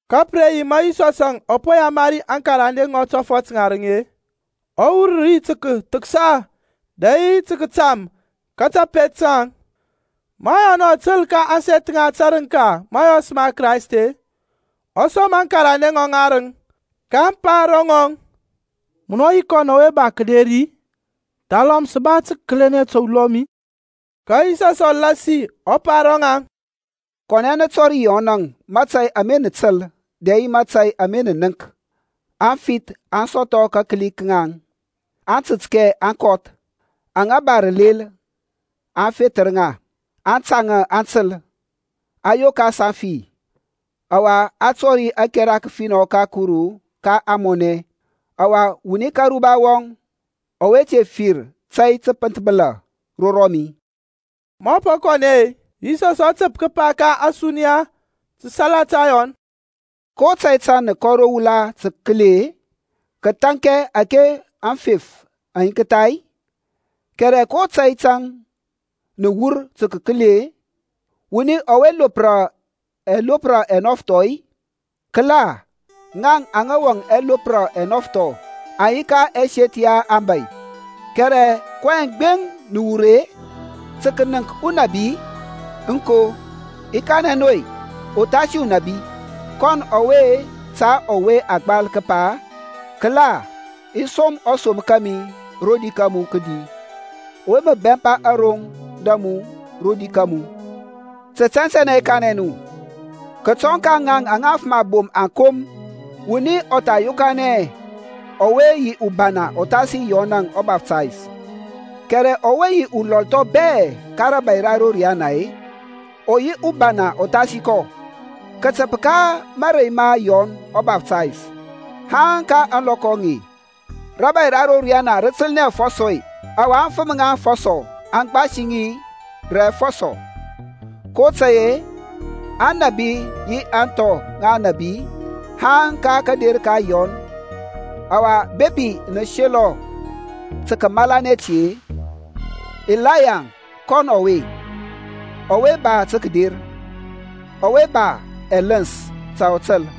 Ka pǝ re yi ma Yisɔsȧŋ ɔ po yamari aŋkarande ŋɔŋ tɔfɔt ŋarǝŋ-e, ɔ wur ri tǝ kǝthǝksa dɛ yi tǝ kǝtam ka tapet taŋ. Ma Yɔnȧŋ ɔ tǝl ka ȧŋseth ŋa tȧrǝŋka mȧyɔs ma Kraist-e, ɔ som akarande ŋɔŋ ŋarǝŋ. kaŋ pa ro ŋɔŋ, Munɔ yi kɔn ɔwe ba kǝder-i, thalɔm sǝ ba tǝ kǝkǝli ta ulɔm-i? Ka Yisɔsȧŋ ɔ lasi ɔ pa ro ŋaŋ, Kɔnɛ nǝ tɔri Yɔn mȧtȧy ama nǝ tǝl dɛ yi ama nǝ nənk. Aŋfith aŋ sɔthɔ kakǝli ka ŋaŋ, aŋtǝtkɛ aŋ kɔth, aŋa ba rǝlel-e, a fethǝr ŋa, aŋtȧŋȧ aŋ tǝl, a yokas aŋfi-e, ɔwa a tɔri ȧkɛra kǝfinɔ ka Kuru ka ȧŋmɔnɛ. Ɔwa wuni ka aruba wɔŋ ɔwe te fir tȧy tǝpǝnthbǝla ro rɔmi. Maŋ po kɔnɛ-e, Yisɔs ɔ tǝp kǝpa ka ȧsuniya ta salata Yɔn, Ko tȧy tȧŋ nǝ kɔ ro wula tǝ kǝkǝli-e? Kǝthȧŋkɛ ȧke aŋfef aŋ yinktha-i? Kɛrɛ ko tȧy tȧŋ nǝ wur tǝ kǝkǝli-e? Wuni ɔwe lopra ɛlopra ɛnɔfthɔ-i? Kǝla, ŋaŋ aŋa wɔŋ ɛlopra ɛnɔfthɔ aŋ yi ka ɛseth ya aŋbȧy. Kɛrɛ kɔyɛŋ gbeŋ nǝ wur-e? Tǝ kǝnǝŋk unabi-i? Aŋko i kanɛ nu-e, uthasi unabi. Kɔn ɔwe ta ɔwe a gbal kǝpa, Kǝla i som ɔsom kȧmi roder ka mu kǝdi, Ɔwe mǝ bɛmpa aroŋ da mu rodi kȧmu. Tǝ tɛntɛnɛ i kanɛ nu, kǝtɔŋ ka ŋaŋ aŋa afǝm abom aŋ kom wuni ɔ tha yokanɛ hɛ ɔwe yi ubana uthasi Yɔnȧŋ ɔBaftays. Kɛrɛ ɔwe yi ɔlɔl thɔŋ bɛ ka rȧbȧy ra ro riyana ɔ yi ubana uthasi kɔ. Kǝtǝp ka mȧrey ma Yɔn ɔBaftays haŋ ka ȧŋlɔkɔ aŋe rȧbȧy ra ro riyana rǝ tǝlnɛ afɔsɔ-e, ɔwa aŋfǝm ŋa afɔsɔ aŋ gbasi ŋi rǝ afɔsɔ. kotȧy-e aŋnabi yi aŋthɔ aŋ nȧbi haŋ ka kȧder ka Yɔn. Ɔwa bepi nǝ selɔ tǝ kǝmalanɛ ti-e, Ilaya kɔn ɔwe, ɔwe ba tǝ kǝder. Ɔwe ba ɛlǝns ta ɔ tǝl.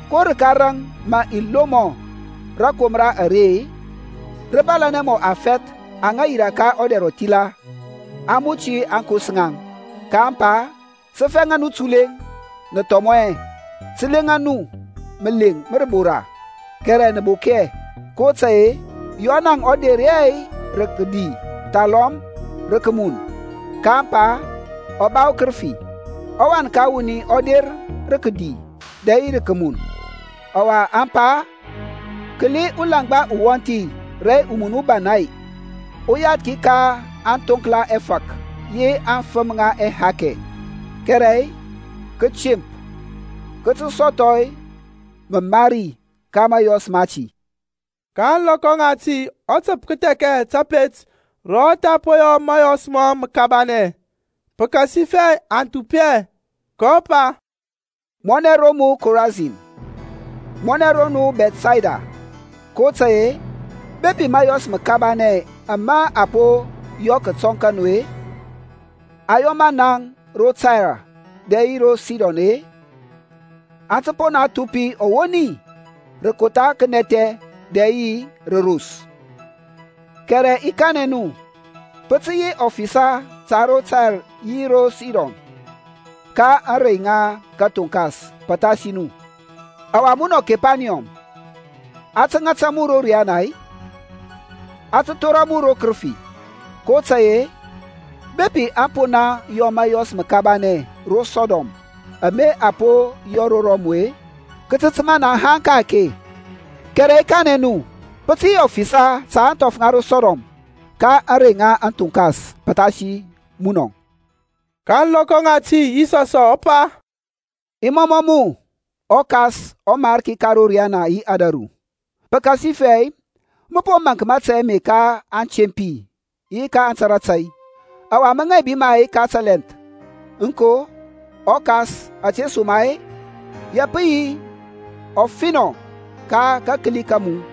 Ko rǝka raŋ mǝ i lomɔ rȧkomra are-e? Rǝ bȧlȧnɛ mɔ afɛth aŋa yirȧ ka ɔdɛr ɔthila, aŋ muti aŋkos ŋaŋ, kaŋ pa, Sǝ fɛŋa nu tulɛŋ, nǝ thɔmɔ hɛ; sǝ leŋa nu mǝleŋ ma rǝbora, kɛrɛ nǝ bok hɛ. kotȧy-e Yɔnȧŋ ɔ der hɛ rǝ kǝdi thalɔm rǝ kǝmun, kaŋ pa, Ɔ ba ukǝrǝfi. ƆWan ka wuni ɔ der rǝ kǝdi dɛ yi rǝ kǝmun, ɔwa aŋ pa, Kǝli ulaŋgba uwɔnthi rɛ umun ubana-e, uyathki ka aŋthoŋkla ɛfȧk yi aŋfǝm ŋa ɛhakɛ. Kɛrɛ kǝtemp kǝ tǝ sɔthɔ mǝmari ka mȧyɔs mati. Ka ȧŋlɔkɔ ŋati ɔ tǝp kǝthɛkɛ tapet ro ɔ tha po yɔ mȧyɔs mɔŋ mǝkabanɛ, pǝkasifɛ aŋ thupi hɛ, kɔ pa, Mɔnɛ ro mu Korasin! Mɔnɛ ro mu Bɛthsayda! kotȧy-e bepi mȧyɔs mǝkabanɛ ama a po yɔ kǝtɔŋ ka nu-e, a yɔ ma naŋ ro Tair dɛ yi ro Sidon-e, aŋ tǝ po naŋ thupi ɔwoni rǝ kotha kǝnɛthɛ dɛ yi rǝ ros. Kɛrɛ i kanɛ nu, pǝ tǝ yi ɔfisa ta ro Tair yi ro Sidon ka ȧŋrey ŋa kǝthoŋkas pǝthasi nu. Ɔwa munɔ Kepaniyɔm, a tǝ ŋata mu ro riana-i? A tǝ thora mu ro kǝrǝfi! kotȧy-e bepi aŋ po naŋ yɔ mȧyɔs mǝkabanɛ ro Sɔdɔm ama a po yɔ ro mu-e, kǝ tǝ tǝma naŋ haŋ ka-ake. Kɛrɛ i kanɛ nu, pǝ tǝ yi ɔfisa ta ȧŋthɔf ŋa ro Sɔdɔm ka ȧŋrey ŋa kǝthoŋkas pǝthasi munɔ. Ka ȧŋlɔkɔ ŋati Yisɔsȧŋ ɔ pa, I mɔmɔ mu, ɔKas ɔMarki ka ro riyana yi ȧdȧru, pǝkasifɛ mǝ po maŋk mȧtȧy ame ka aŋtempi yi aŋtara tȧy, ɔwa mǝ ŋaibi ma ka tǝlɛnth. Aŋko, ɔKas, ȧtesoma-e ya pǝ yi ɔfinɔ ka kakǝli ka mu.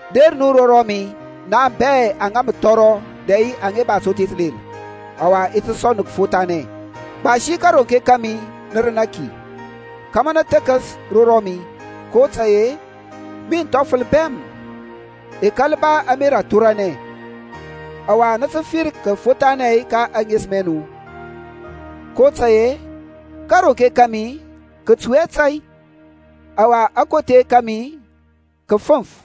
Der nu ro rɔmi, naŋ bɛ aŋa mǝ thɔrɔ dɛ yi aŋa ba tothe tǝlel, ɔwa i ti sɔŋ nu kǝfothanɛ. Gbasi kȧronke kȧmi nǝ rǝnȧ ki, kȧmȧ nǝ thǝkǝs ro rɔmi; kotȧy-e min thɔfǝl bɛm, i kȧl ba ȧmerȧ athoranɛ, ɔwa nǝ tǝ fir kǝfothanɛ ka ɛŋesǝm ɛ nu. kotȧy-e kȧronke kȧmi kǝ tui hɛ tȧy, ɔwa akothe kȧmi kǝ fǝŋf.